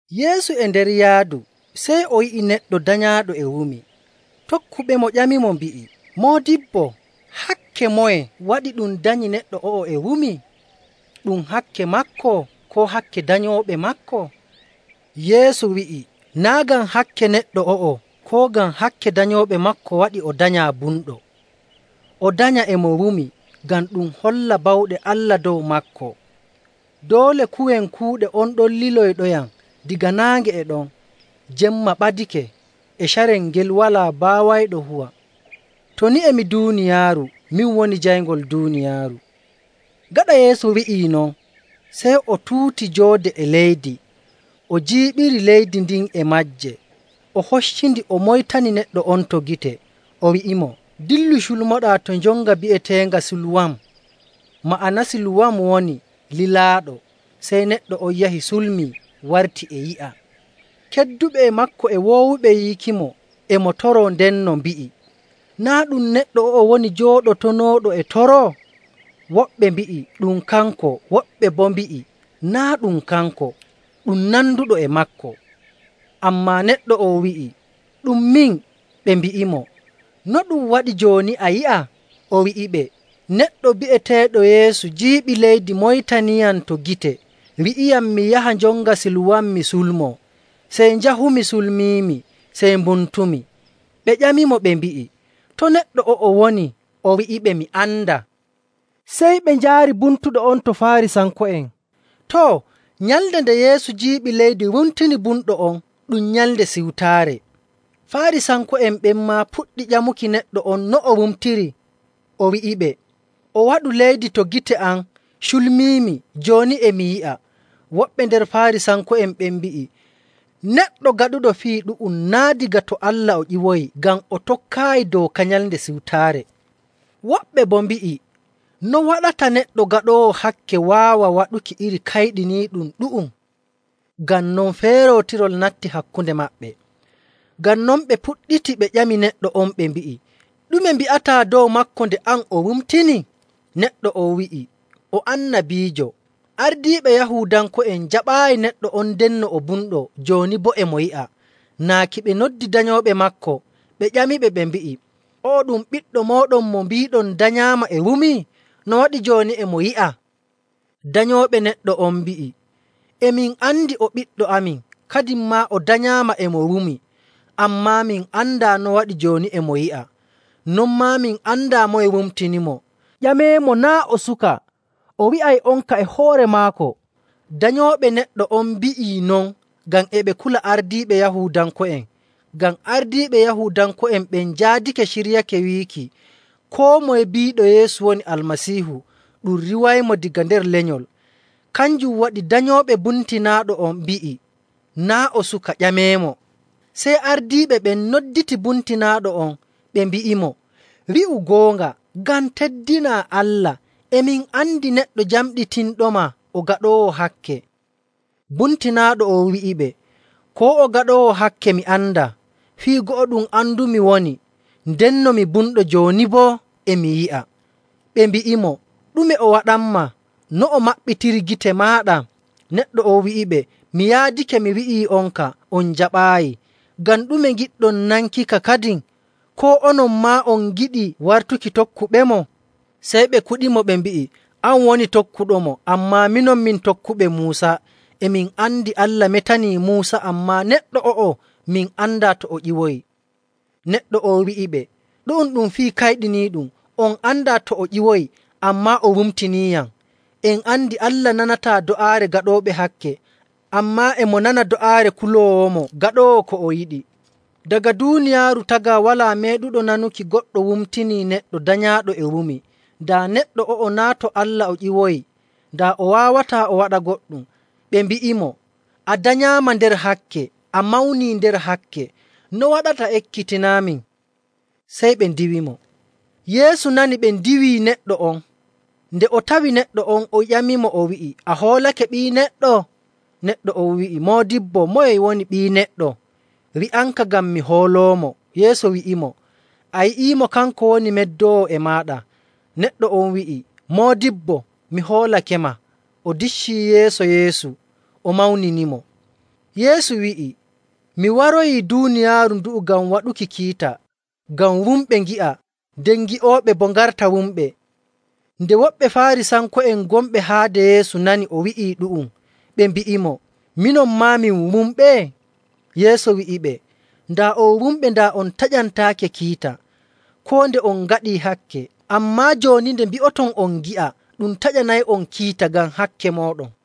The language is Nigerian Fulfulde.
Yeesu e nder yaadu, sey o yi'i neɗɗo danyaaɗo e wumi. Tokkuɓemo ƴamimo mbi'i, “Moodibbo, hakke moye waɗi ɗum danyi neɗɗo o'o e wumi? Ɗum hakke maako koo hakke danyooɓe maako?” Yeesu wi'i, “Naa' ngam hakke neɗɗo o'o koo ngam hakke danyooɓe maako waɗi o danyaa bumɗo. O danyaa e mo wumi ngam ɗum holla bawɗe Allah dow maako. Doole kuwen kuuɗe on ɗon liloyɗoyam daga naange e ɗon. Jemma ɓadake. E carel ngel walaa baawayɗo huwa. To ni e mi duuniyaaru, min woni jayngol duuniyaaru.”. Gaɗa Yeesu wi'ii non, sey o tuuti joode e leydi, o jiiɓiri leydi ndin e maaje, o hoccindi, o moytani neɗɗo on to gite. O wi'imo, “Dillu, culmoɗaa to njonga bi'eteenga Siluwam.” Ma'ana Siluwam woni “Lilaaɗo.” Sey neɗɗo on yahi sulmii, warti e yi'a. Kedduɓe e maako e woowuɓe yiikimo e mo toroo ndenno mbi'i, “Naa' ɗum neɗɗo o'o woni jooɗotonooɗo e toroo?” Woɓɓe mbi'i, “Ɗum kanko.” Woɓɓe boo mbi'i, “Naa' ɗum kanko, ɗum nanduɗo e maako.” Ammaa neɗɗo on wi'i, “Ɗum min.” Ɓe mbi'imo, “No ɗum waɗi jooni a yi'a?” O wi'iɓe, “Neɗɗo bi'eteeɗo Yeesu jiiɓi leydi moytaniyam to gite, wi'iyam mi yaha njonga Siluwam mi sulmoo. Sey njahumi, culmiimi sey mbumtumi.” Ɓe ƴamimo ɓe mbi'i, “To neɗɗo o'o woni?” O wi'iɓe, “Mi andaa.” Sey ɓe njaari bumtuɗo on to Faarisanko'en. Too, nyalnde nde Yeesu jiiɓi leydi wumtini bumɗo on ɗum Nyalnde Siwtaare. Faarisanko'en ɓen maa puɗɗi ƴamuki neɗɗo on no o wumtiri, o wi'iɓe, “O waɗu leydi to gite am, culmiimi, jooni e mi yi'a.” Woɓɓe nder Faarisanko'en ɓen mbi'i, “Neɗɗo gaɗuɗo fii ɗu'um naa' daga to Allah o ƴiwoyi, ngam o tokkaayi dooka Nyalnde Siwtaare.” Woɓɓe boo mbi'i, “No waɗata neɗɗo gaɗoowo hakke waawa waɗuki iri kayɗiniiɗum ɗu'um?” Ngam non, feerootirol natti hakkunde maɓɓe. Ngam non, ɓe puɗɗiti ɓe ƴami neɗɗo on ɓe mbi'i, “Ɗume mbi'ataa dow maako, nde an o wumtini?” Neɗɗo on wi'i, “O annabiijo.” Ardiiɓe Yahuudanko'en njaɓaayi neɗɗo on ndenno o bumɗo jooni boo e mo yi'a, naaki ɓe noddi danyooɓe maako, ɓe ƴamiɓe ɓe mbi'i, “O'o ɗum ɓiɗɗo mooɗon mo mbiiɗon danyaama e wumi? No waɗi jooni e mo yi'a?” Danyooɓe neɗɗo on mbi'i, “E min andi o ɓiɗɗo amin, kadin maa o danyaama e mo wumi. Ammaa min andaa no waɗi jooni e mo yi'a, non maa min andaa moye wumtinimo. Ƴameemo, naa' o suka, o wi'ay'onka e hoore maako.” Danyooɓe neɗɗo on mbi'ii non ngam e ɓe kula ardiiɓe Yahuudanko'en. Ngam ardiiɓe Yahuudanko'en ɓen njaadake ciryake wiiki koo moye biiɗo Yeesu woni Almasiihu ɗum riiwaymo daga nder lenyol. Kanjum waɗi danyooɓe bumtinaaɗo on mbi'i, “Naa' o suka, ƴameemo.” Sey ardiiɓe ɓen nodditii bumtinaaɗo on, ɓe mbi'imo, “Wi'u goonga ngam teddinaa Allah. E min andi neɗɗo jamɗitinɗoma o gaɗoowo hakke.” Bumtinaaɗo on wi'iɓe, “Koo o gaɗoowo hakke mi andaa, fii go'o ɗum andumi woni ndenno mi bumɗo, jooni boo e mi yi'a.” Ɓe mbi'imo, “Ɗume o waɗanmaa? No o maɓɓitiri gite maaɗa?” Neɗɗo on wi'iɓe, “Mi yaadake mi wi'ii'onka on njaɓaayi. Ngam ɗume ngiɗɗon nankika kadin? Koo onon maa on ngiɗi wartuki tokkuɓemo?” Sey ɓe kuɗimo ɓe mbi'i, “An woni tokkuɗomo, ammaa minon min tokkuɓe Muusa! E min andi Allah metanii Muusa, ammaa neɗɗo o'o min andaa to o ƴiwoyi.” Neɗɗo on wi'iɓe, “Ɗu'um ɗum fii kayɗiniiɗum! On andaa to o ƴiwoyi, ammaa o wumtiniiyam. En andi Allah nanataa do'aare gaɗooɓe hakke, ammaa e mo nana do'aare kuloowomo gaɗoowo ko o yiɗi. Daga duuniyaaru tagaa walaa meeɗuɗo nanuki goɗɗo wumtinii neɗɗo danyaaɗo e wumi. Daa neɗɗo o'o naa' to Allah o ƴiwoyi, daa o waawataa o waɗa goɗɗum.” Ɓe mbi'imo, “A danyaama nder hakke a mawnii nder hakke, no waɗata ekkitinaamin?” Sey ɓe ndiiwimo. Yeesu nani ɓe ndiiwii neɗɗo on. Nde o tawi neɗɗo on, o ƴamimo o wi'i, “A hoolake Ɓii Neɗɗo?” Neɗɗo on wi'i, “Moodibbo, moye woni Ɓii Neɗɗo? Wi'amka ngam mi hooloomo.” Yeesu wi'imo, “A yi'iimo, kanko woni meddoowo e maaɗa.” Neɗɗo on wi'i, “Moodibbo, mi hoolakema.” O diccii yeeso Yeesu, o mawninimo. Yeesu wi'i, “Mi waroyii duuniyaaru ndu'u ngam waɗuki kiita, ngam wumɓe ngi'a nden gi'ooɓe boo ngarta wumɓe.” Nde woɓɓe Faarisanko'en gonɓe haade Yeesu nani o wi'i ɗu'um, ɓe mbi'imo, “Minon maa min wumɓe?” Yeesu wi'iɓe, “Daa on wumɓe, daa on taƴantaake kiita koo nde on ngaɗii hakke. Ammaa jooni nde mbi'oton on ngi'a, ɗum taƴanay'on kiita ngam hakke mooɗon.”